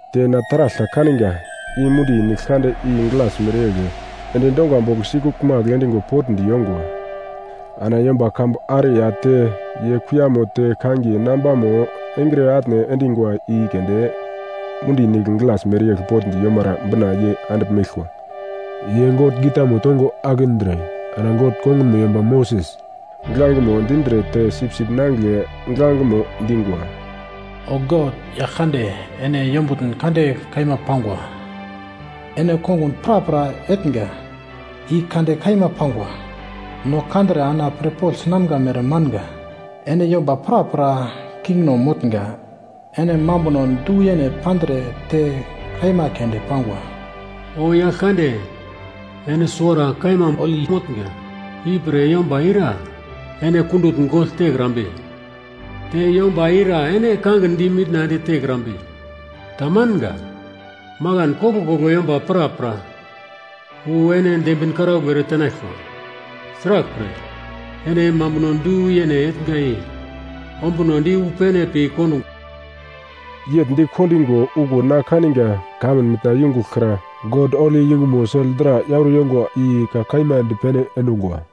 Te na taragl ta kaninga, i mundi nigl kande i glas mereyegl endi donga bogl sikuglmagl endigo potndi yongwa. Ana yomba kambu are ya te ye kuiyamo te kangiye nambamo engre atne endingwa i keunde mundi nigl glas mereyegl potndi yomara bina ye andigl meglkwa. Ye God gitamo tongo akindre, ana God kongunmo yomba Moses giglangemo dindre te Sipsip Nangigle giglangemo dingwa: “O God, Yaglkande, ene yombutn kande kaima pangwa. Ene kongun prapra etnga, i kande kaima pangwa, no kandre ana pirpogl sinamga mere manga! Ene yomba prapra kingno motnga, ene mambunon du-yene pandre te kaima keunde pangwa! O Yaglkande, ene suwara kaima holi motnga. Ipre yomba ira ene kundutn gogl tekrambe? Te yomba ira ene kangin di mitna ende tekrambe? Tamanga. Makan koglkoglo yomba prapra wu ene dembin karaugl eretenaglkwa. Sraglpre, ene mambuno du-yene etnga i ombunodi wu pene pi kondungwa.” Yegl di kendingo okuwo na kaninga kamun mitna yungugl kra God holi yungumo sel dra yauro yongwa i ka kaima dipene endungwa.